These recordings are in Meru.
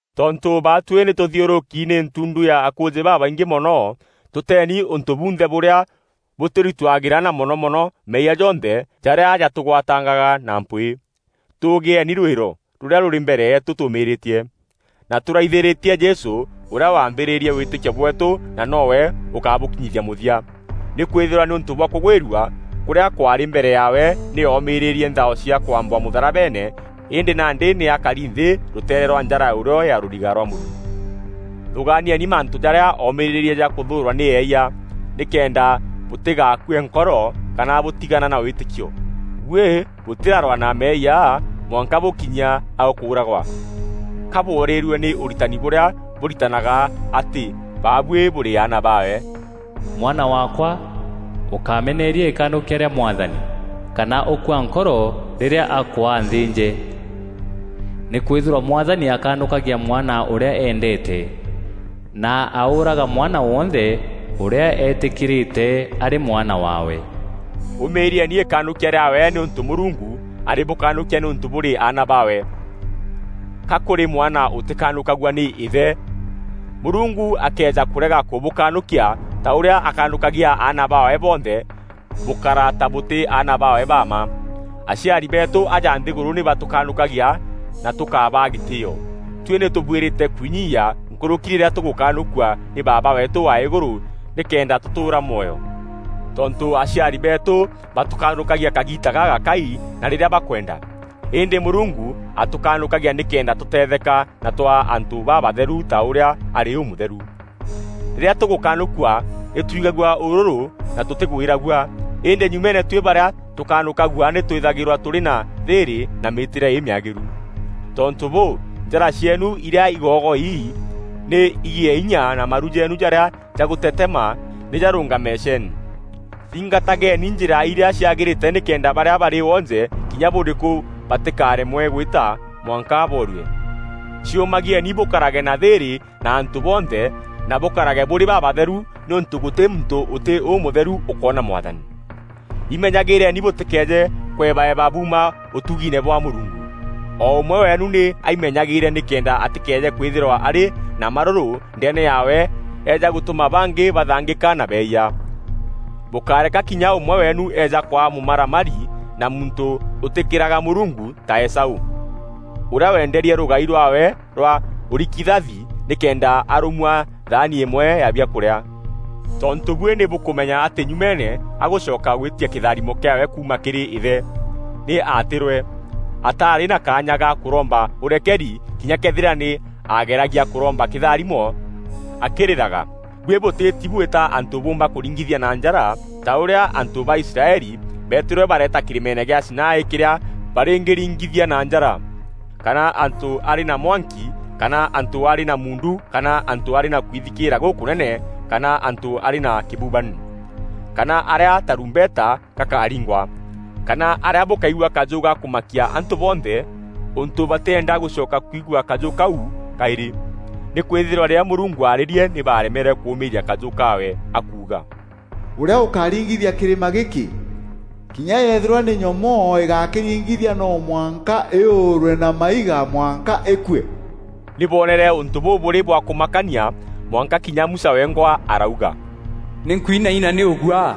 Tontû baatuî nî tûthiûrûki nî ntundu ya akûûjî babaingî mono, tûteni ûntû bunthe bûrîa bûtûritûagîra, na mono mono meeyia jonthe jarîa jatûgwatangaga na mpwîî. Tûûgîeni rûîro rûrîa rûrî mbere yeetû tûûmîrîtie, na tûraithîrîtie Jesû, ûrîa waambîrîrie wîtîkio bweetû na no we ûkabûkinyithia mûthia. Nîkwîthîrwa nîûntû bwa kûgwîrua kûrîa kwaarî mbere yaawe nî oomîrîrie nthao cia kwambwa mûtharabeene îndî nandî nî akari nthî rûteere rwa njara ya ûrîo ya rûriga rwa Mûrungu. Thûgaanieni mantû jarîa oomîrîrie ja kûthûûrwa nî eeyia, nîkenda bûtîgaakue nkoro kana bûtigana na wîtîkio. Buî bûtîrarwaa na meeyia mwanka bûkinyia a kûûragwa. Ka bworîîrue nî ûritani bûrîa bûritanaga atî baabuî bûrî aana baawe? “Mwana waakwa, ûkameneria îkanûkia rîa Mwathani, kana ûkua nkoro rîrîa akûaa nthînje. Nîkwîthîrwa Mwathani akanûkagia mwana ûrîa eendeete, na aûûraga mwana wonthe ûrîa eetîkîîrîte arî mwana waawe.” Ûmîîrieni îkanûkia rîaawe nîûntû Mûrungu arîbûkanûkia nîûntû bûrî aana baawe. Ka kûrî mwana ûtîkanûkagua nî îthe? Mûrungu akëeja kûrega kûbûkanûkia, ta ûrîa akanûkagia aana baawe bonthe, bûkara ta bûtî aana baawe ba mma. Aciari beetû aja nthîgûrû nî batûkanûkagia na tûkabaa gîtîîo. Tuî nî tûbuîrîte kwinyiia nkûrûki rîrîa tûgûkanûkua nî Baaba weetû wa îgûrû nîkenda tûtûûra mwoyo? Tontû aciari beetû batûkanûkagia kagiita gagakai na rîrîa bakwenda, îndî Mûrungu atûkanûkagia nîkenda tûteetheka na twaa antû babatheru ta ûrîa arî ûmûtheru. Rîrîa tûgûkanûkua nî twigagua ûrûrû na tûtîgwîragua, îndî nyumeene tuî barîa tûkanûkagua nî twîthagîrwa tûrî na thîîrî na mîîtîre îmîagîru. Tontû bûû, njara cieenu îrîa igoogoi nî igîe inya na maru jeenu jarîa jagûtetema nî jarûngame ceeni. Thingatageni njîra irîa ciagîrîte nîkenda barîa barî wonje kinya bûrîkû batîkaremwe gwîta mwanka boorue. Ciûmagieni bûkarage na thîîrî na antû bonthe na bûkarage bûrî babatheru nîûntû gûtî muntû ûtî ûmûtheru ûkoona Mwathani. Imenyagîîreni bûtîkeeje kwebaeba buuma ûtugiine bwa Mûrungu. O ûmwe weenu nî aimenyagîîre nîkenda atîkeeje kwîthîrwa arî na marûrû ndeene yaawe eeja gûtûma bangî bathangîka na beeyia. Bûkáreka kinya ûmwe weenu eeja kwaa mûmaramari na muntû ûtîkîraga Mûrungu ta Esaû, ûrîa weenderie rûgai rwaawe rwa ûrikithathi nîkenda arûmua thaani îmwe ya biakûrîa. Tontû buî nî bûkûmenya atî nyumeene agûcoka gwîtia kîtharimo kîaawe kuuma kîrî îthe, nî aatîrwe. Ataarî na kaanya ga kûromba ûrekeri kinya këethîra nî aageragia kûromba kîtharimo akîrîraga. Buî bûtîîti bwîta antû bûûmba kûringithia na njara, ta ûrîa antû ba Israeli beetîrwe bareeta kîrîmeene gîa Sinai kîrîa barîngîringithia na njara, kana antû arî na mwanki kana antû arî na muundu kana antû arî na kwithikîîra gûkûnene kana antû arî na kîbubani, kana arîa tarûmbeta gakaringwa kana arîa bûkaigua kajû ga kûmakia antû bonthe ûntû batîenda gûcoka kwigua kajû kau kaîrî. Nîkwîthîrwa rîrîa Mûrungu aarîrie nî baaremerwe kûûmîîria kajû kaawe akuuga, “Ûrîa ûkaringithia kîrîma gîkî, kinya yëethîrwa nî nyomoo îgakîringithia no mwanka îûûrwe na maiga mwanka îkue.” Nî boonere ûntû bûu bûrî bwa kûmakania mwanka kinya Musa wengwa arauga, “Nî nkwinaina nî ûguaa.”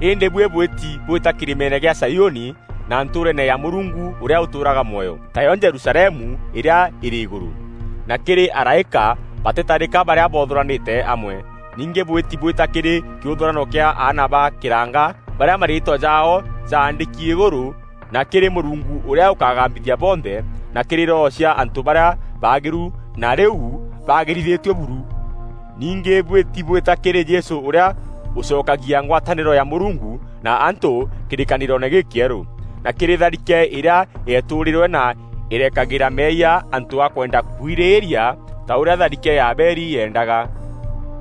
Îndî buî bwîti bwita kîrîmeene kîa Zaiûni na ntûûreene ya Mûrungu ûrîa ûtûûraga mwoyo, tayo Jerusalemu îrîa îrî îgûrû, na kîrî araîka batîtarîka barîa boothûranîte amwe. Ningî bwîti bwîta kîrî kîûthûrano kîa aana ba kîranga barîa mariîtwa jaao jaandîki îgûrû na kîrî Mûrungu ûrîa ûkagambithia bonthe na kîrî roho cia antû barîa baagîru na rîu baagîrithîtue buru. Ningî bwîti bwîta kîrî Jesû, ûrîa ûcokagia ngwatanîro ya Mûrungu na antû kîrîkanîroone gîkîerû, na kîrî tharike îrîa yeetûûrîrwe na îrekagîra meeyia antû a kwenda kwirîîria ta ûrîa tharike ya Abeli yeendaga.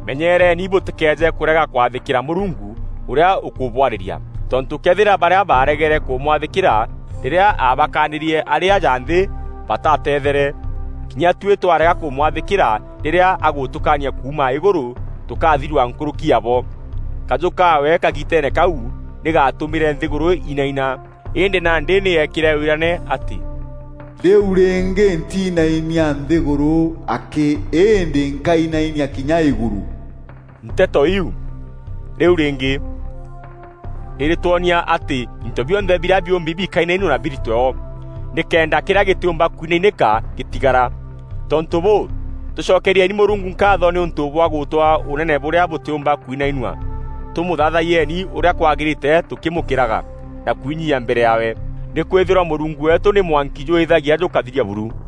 Menyeereeni bûtîkeeje kûrega kwathîkîra Mûrungu, ûrîa ûkûbwarîria. Tontû këethîra barîa baaregere kûmwathîkîra rîrîa aabakaanîrie arî aja nthî bataatethere, kinya tuî twarega kûmwathîkîra rîrîa agûtûkaania kuuma îgûrû tûkaathirua nkûrûki ya bo. Kajû kaawe kagiiteene kau nî gaatûmîre nthîgûrû inaina, îndî nandî nî eekîre wîrane atî, “Rîu rîngî ntinainia nthîgûrû akî îndî nkainainia kinya îgûrû.” Nteto iu “Rîu rîngî” irîtwonia atî into bionthe birîa biûmbi bikainainua na biritwe o, nîkenda kîrîa gîtîûmba kwinainîka gîtigara. Tontû bûû, tûcokerieni Mûrungu nkaatho nîûntû bwa gûtûaa Ûnene bûrîa bûtîûmba kwinainua. Tûmûthathayieni ûrîa kwagîrîte tûkîmûkîraga na kwinyiia mbere yaawe. Nîkwîthîrwa Mûrungu weetû nî mwanki jûîîthagia jûkathiria buru.